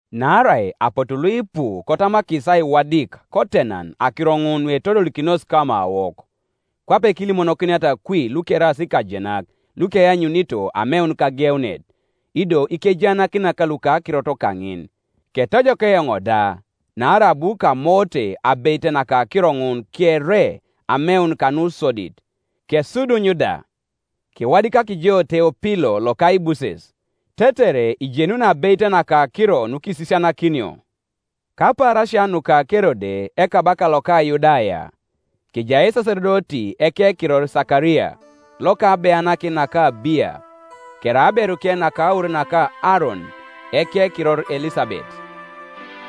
Naarai apotu luipu kotamakis aiwadik kotenan akiro ŋun nuetodolikinos kamawok, kwape kiilimonokiniata kwi lukeraas ikajenak lukeanyunito ameun kageunet, ido ikejaanakinak luka akirot kaŋin, ketojok eoŋ da, naarai abu kamoote abeit naka akiro ŋun kere ameun kanusodit, kesuduny da, kewadikak jo Teopilo lokaibuses, tetere ijenuni abeit naka akiro nukiisisianakinio. Kapaarasia nuka Kerode ekabaka loka Yudaya, kejai esasedoti ekekiror Sakaria, loka abeanakin naka Abiya: kerai aberuke naka aur naka Aaron, ekekiror Elisabet.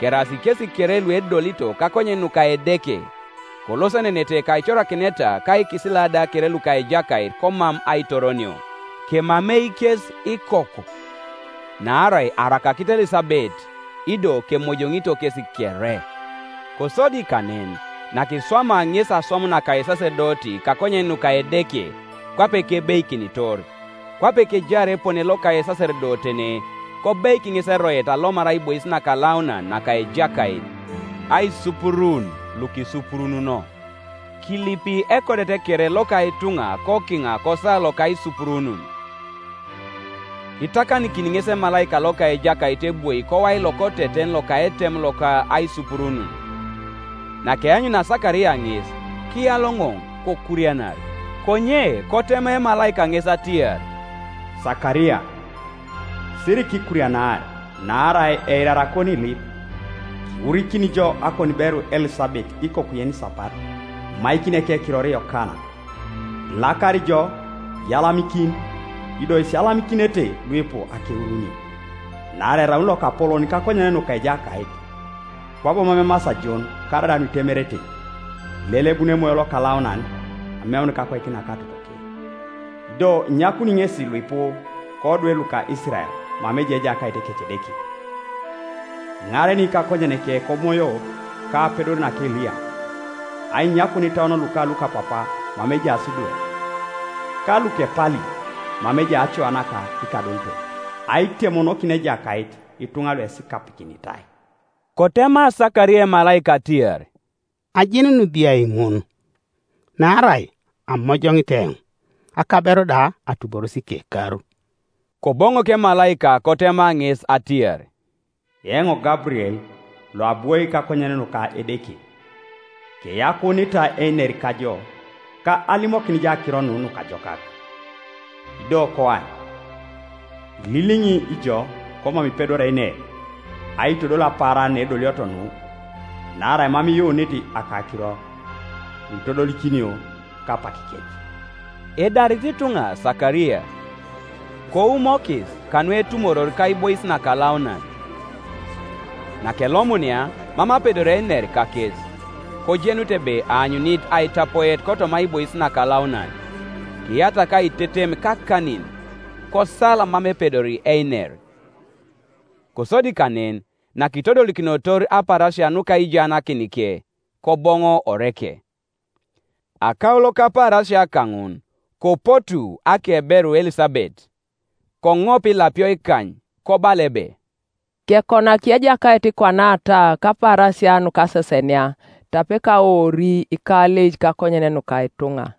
Keraas kesi kere luedolito kakonyen nuka Edeke, kolosenenete kaicorakineta ka ikisila da kere luka Ejakait komam aitoronio. Kemamei kes ikoku, naarai arakakit Elisabet, ido kemojoŋito kesi kere. Kosodi kanen, nakiswamaa ŋesi aswam naka esasedoti kakonyen nuka Edeke, kwape kebeikinitor, kwape kejaar epone loka esasedotene, kobeik ŋes eroet alomar aibois nakalaunan naka Ejakait, aisupuruun lukisupurununo. Kilipi ekodet kere loka ituŋa kokiŋa kosawa loka aisupuruun. Kitakanikin ŋes emalaika loka Ejakait ebwoi kowai lokoteten loka etem loka aisupuruun. Nakeanyunia Sakaria ŋes, kiyaloŋoŋ, kokurianar. Konye kotema emalaika ŋes atiar, “Sakaria, sirikikurianar; naarai eirar akoniilip, kiwurikini jo akoniberu Elisabet ikoku yenisapat, imaikini ekekiror Yokana. Ilakar ijo, iyalamikin; ido isiyalamikinete luipu akeurunio. Naarai eraun lokapolon kakonyen nuka Ejakait, kwabo mam emasi ajon karaida nuitemerete; ilelebun Emoyo Lokalaunan, ameun kakoik naka totoke, Ido inyakuni ŋesi luipu kodwe luka Isirael mama ejai Ejakait Ekecedeke. Iŋareni kakonyeneke komoyo ka apedor naka Eliya, ainyakun itauon luka lukapapa mama ejaas idwe, ka lukepali mama ejai acoa naka ikadolitok; aitemonokin Ejakait ituŋa luesikapikinitai.” Kotema Sakaria emalaika atiar, “Ajenuni biai ŋun? Naarai amojoŋit eoŋ, akaberu da atuboros ikekar.” Koboŋok emalaika kotema ŋes atiar, “Eoŋ Gaburiel, loabwoi kakonyen nuka Edeke; keyakuunitai einer kajo, ka alimokin jo akiro nu nukajokak. Ido koany, ililiŋi ijo komam ipedori einer, aitodol apaaran naedolioto nu, naarai mam iyuunit akakiro, nuitodolikinio kapakikec.” Edarito ituŋa Sakaria, koumokis kanu etumoror kaibois nakalaunan. Nakelomunia, mam apedori einer kakes: kojenut ebe aanyunit aitapoet kotoma aibois nakalaunan: kiyatak aitetem kakanin, kosal mam epedori einer. Kosodi kanen, nakitodolikinotor apaarasia nuka aijaanakinike, koboŋo oreke. Akaulo kapaarasia kaŋun kopotuu akeberu Elisabet; koŋop ilapio ikany, kobala ebe, “Kekonak Ejakait kwanata kapaarasia nukasesenia, tape kawoori ikaleic kakonyen nuka ituŋa.”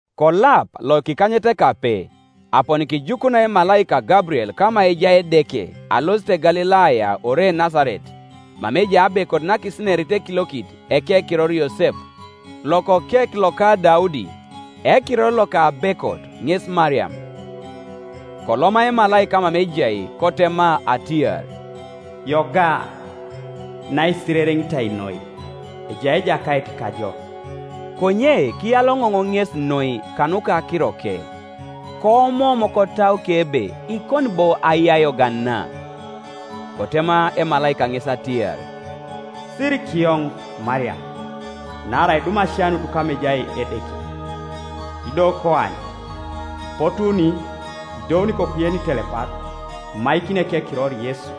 Kolap lokikanyetekape aponi kijukunai emalaika Gaburiel kama ejai Edeke alosit Galilaya ore Nasaret, mama ejai abekot nakisinerit ekiliokit ekekiror Yosep, lokokek loka Daudi; ekiror loka abekot ŋes Mariam. Koloma emalaika mama ejai, kotema atiar, “Yoga, naisirereŋitoi noi, ejai Ejakait kajo!” Konye kiyaloŋoŋ ŋesi noi kanuka akiroke, koomoom kotauke ebe ikoni bo ai ayogan na, Kotema emalaika ŋes atiar, “Sirikiyoŋ, Mariam, naarai idum asianut kama ejai Edeke. Ido koany, ipotuuni, idouni ikoku yenitelepat, imaikini ekekiror Yesu.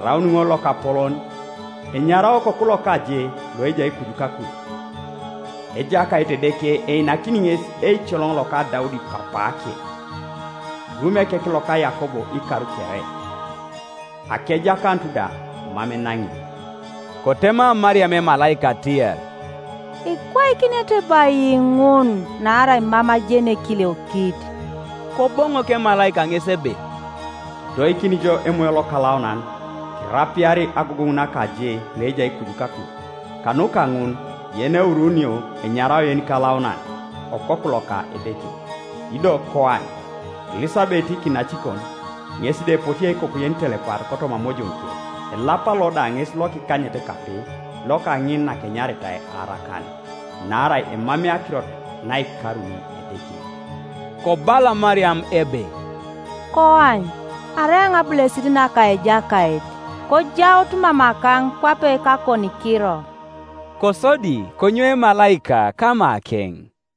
Eraun ŋol lokapolon, enyarao Okoku loka je Ioejai kuju kakuj; Ejakait Edeke einakini ŋes eicoloŋ loka Daudi papaake, irumi ekek loka Yakob ikar kere; akejakanut da mam enaŋi.” Kotema Mariam emalaika atiar, “Ikwaikinete bo ai ŋun, naarai mam ajeni ekiliokit?” Koboŋok emalaika ŋes ebe, “Kidoikini jo Emoyo Lokalaunan, kirapiari agogoŋ naka Je loejai kuju kakuj; kanuka ŋun yeneuruunio enyarao yenikalaunan, Okoku loka Edeke. Ido koany, Elisabet kinacikon, ŋes da epotiei ikoku yenitelepat kotoma amojoŋuke; elap lo da ŋes lokikanyetekape loka ŋin nakenyaritai arakan. Naarai emamei akirot naikaruni Edeke.” Kobala Mariam ebe, “Koany, arai eoŋ abulesit naka Ejakait; kojaut mamakaŋ kwape kakonikiro.” Kosodi konyou emalaika kamakeŋ.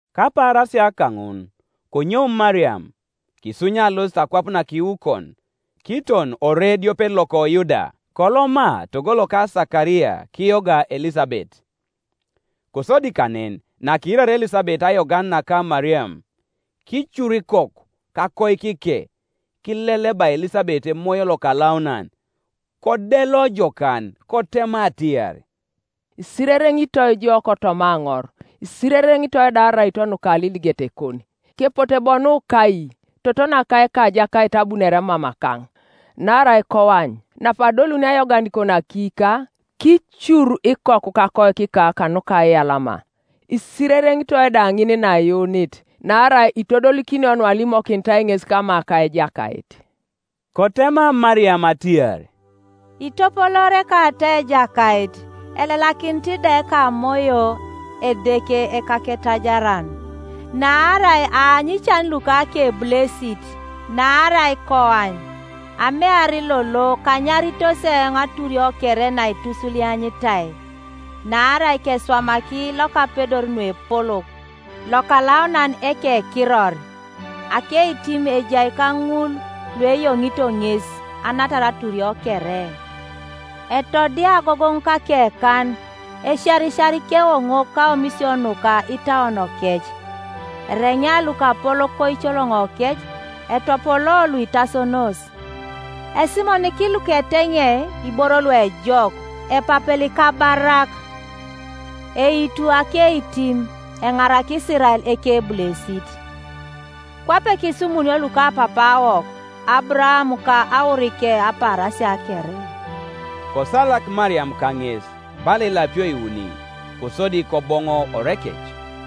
Kapaarasia kaŋun konyou Mariam, kisunya alosit akwap nakiukon, kiton ore ediopet loko Yuda; koloma togo loka Sakaria kiyoga Elisabet. Kosodi kanen, nakiiraria Elisabet ayogan naka Mariam, kicuru ikoku kakoikike; kilelebai Elisabet Emoyo Lokalaunan; kodelo jokan, kotema atiar, “Isirereŋitoi jo kotoma aŋor, isirereŋitoi da araito nuka aliligetekon. Kepote bo nu kai, toto naka Ekajakait abunore mamakaŋ? Naarai koany, napadolunio ayoganikon akiika, kicuru ikoku kakoikika kanuka aiyalama. Isirereŋitoi da ŋin naiyuunit; naarai itodolikinio nualimokinitai ŋes kama ka Ejakait.” Kotema Mariam atiar, “Itopoloori ekatau Ejakait. Elelakinit da ekamoyo Edeke Ekaketaiaran. Naarai aanyu ican luka akebulesit. Naarai koany, amear lolo kanyaritos eoŋ aturio kere naitusulianyitai. Naarai keswamaki Lokapedor nuepolok: Lokalaunan ekekiror. Akeitim ejai kaŋul lueyoŋito ŋes, Anatar aturio kere. Etodia agogoŋ kakekan, Esiarisiar ikewoŋok kaomisio nuka itauonokec. Ereŋea lukapolok koicoloŋokec, Etopolo luitasonos. Esimoniki luketeŋei iboro luejok, Epapel ikabarak. Eitu akeitim, Eŋaraki Isirael ekebulesit. Kwape kisumunio lukapapaawok, Aburaam ka aurike apaarasia kere.” Kosalak Mariam kaŋes bala ilapio iuni, kosodi koboŋo orekec,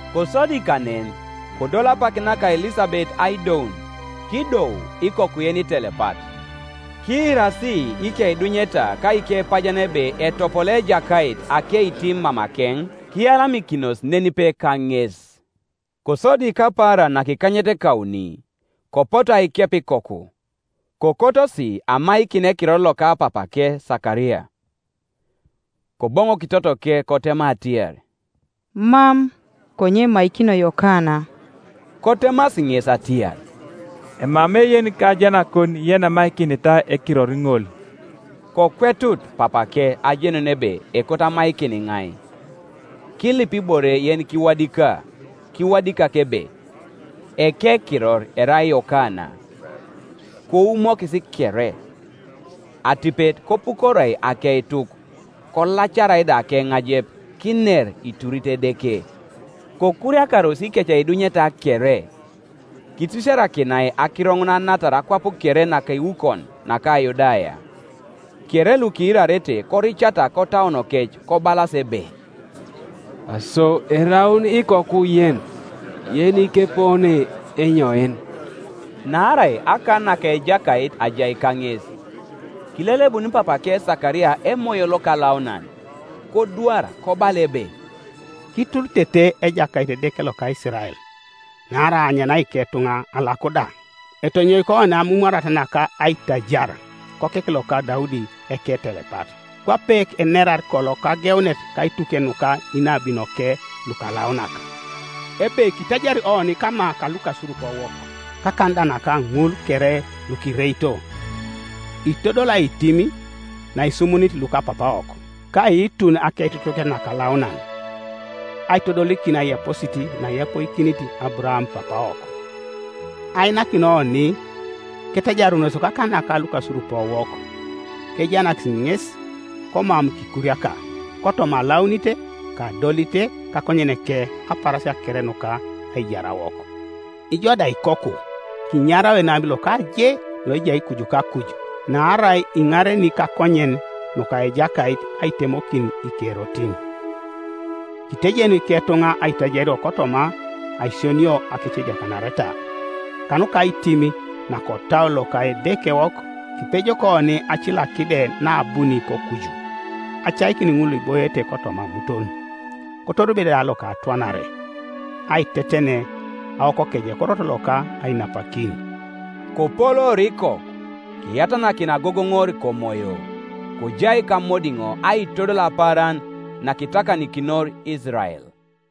Kosodi kanen kodol apak naka Elisabet aidoun, kidou ikoku yenitelepat. Kiirasi ikeidunyeta ka ikepajen ebe etopoloo Ejakait akeitim mamakeŋ, kiyalamikinos nenipe kaŋes. Kosodi kapaaran nakikanyetekauni kopotu aikep ikoku; kokotosi amaikin ekiror loka papake Sakaria. Koboŋok totoke kotema atiar, “Mam, konye emaikinio Yokana.” Kotemasi ŋes atiar, “Emamei yenikajenakon yenemaikinitai ekiror ŋol.” Kokwetut papake ajenun ebe ekoto amaikin iŋai. Kilip ibore yenikiwadika, kiwadik ebe, “Ekekiror erai Yokana.” Koumokis kere. Atipet kopukoroi akeituk, kolacarai da akeŋalep, kiner, iturit Edeke, Kokuriakaros ikeceidunyeta kere, Kitisiarakinai akiro ŋun anatar akwap kere nakiukon naka Yudaya; kere lukiirarete koricata kotauonokec, kobalas ebe, “Aso eraun ikoku yen yenikepone enyoin?” Naarai akan naka Ejakait ajai kaŋes. Kilelebun papake Sakaria Emoyo Lokalaunan, kodwar kobala ebe, “Kituritete Ejakait Edeke loka Isirael, Naarai aanyana iketuŋa alaku da. Etonyoiki oni amumwarat naka aitajar Kokek loka Daudi eketelepat. Kwape enerar kolo kageunet Kaituke nuka inabinoke lukalaunak; Ebe kitajari oni kama kalukasurupowok, Kakan da naka ŋul kere lukireito; Itodoli aitim naesumunit lukapapaawok, Ka aiitun akeitutuket nakalaunan. Aitodolikin aiyaposit naeyapoikinit Aburaam papaawok. Ainakin oni ketajarunos kakan naka lukasurupowok, Kejaanakis ŋes komam kikuriaka; Kotoma alaunit ka adolit kakonyeneke Apaarasia kere nuka aijarawok. Ŋo da ikoku, kinyarao enabi loka Je loejai kuju kakuj; Naarai iŋareni kakonyen nuka Ejakait aitemokin ikerotin. Kitejen iketuŋa aitajario kotoma aisionio akecediakanareta. Kanuka aitim nakotau loka Edekewok, Kipejok oni Acilakide naabuni kokuju. Acaikin ŋul luiboete kotoma amuton, Kotoribe da lokatwanare, Aiteten awokokeie korot loka ainapakin.” Kopoloor ikoku, kiyatanakin agogoŋor komoyo; kojai kamodiŋo aitodol apaaran nakitakanikinor Isirael.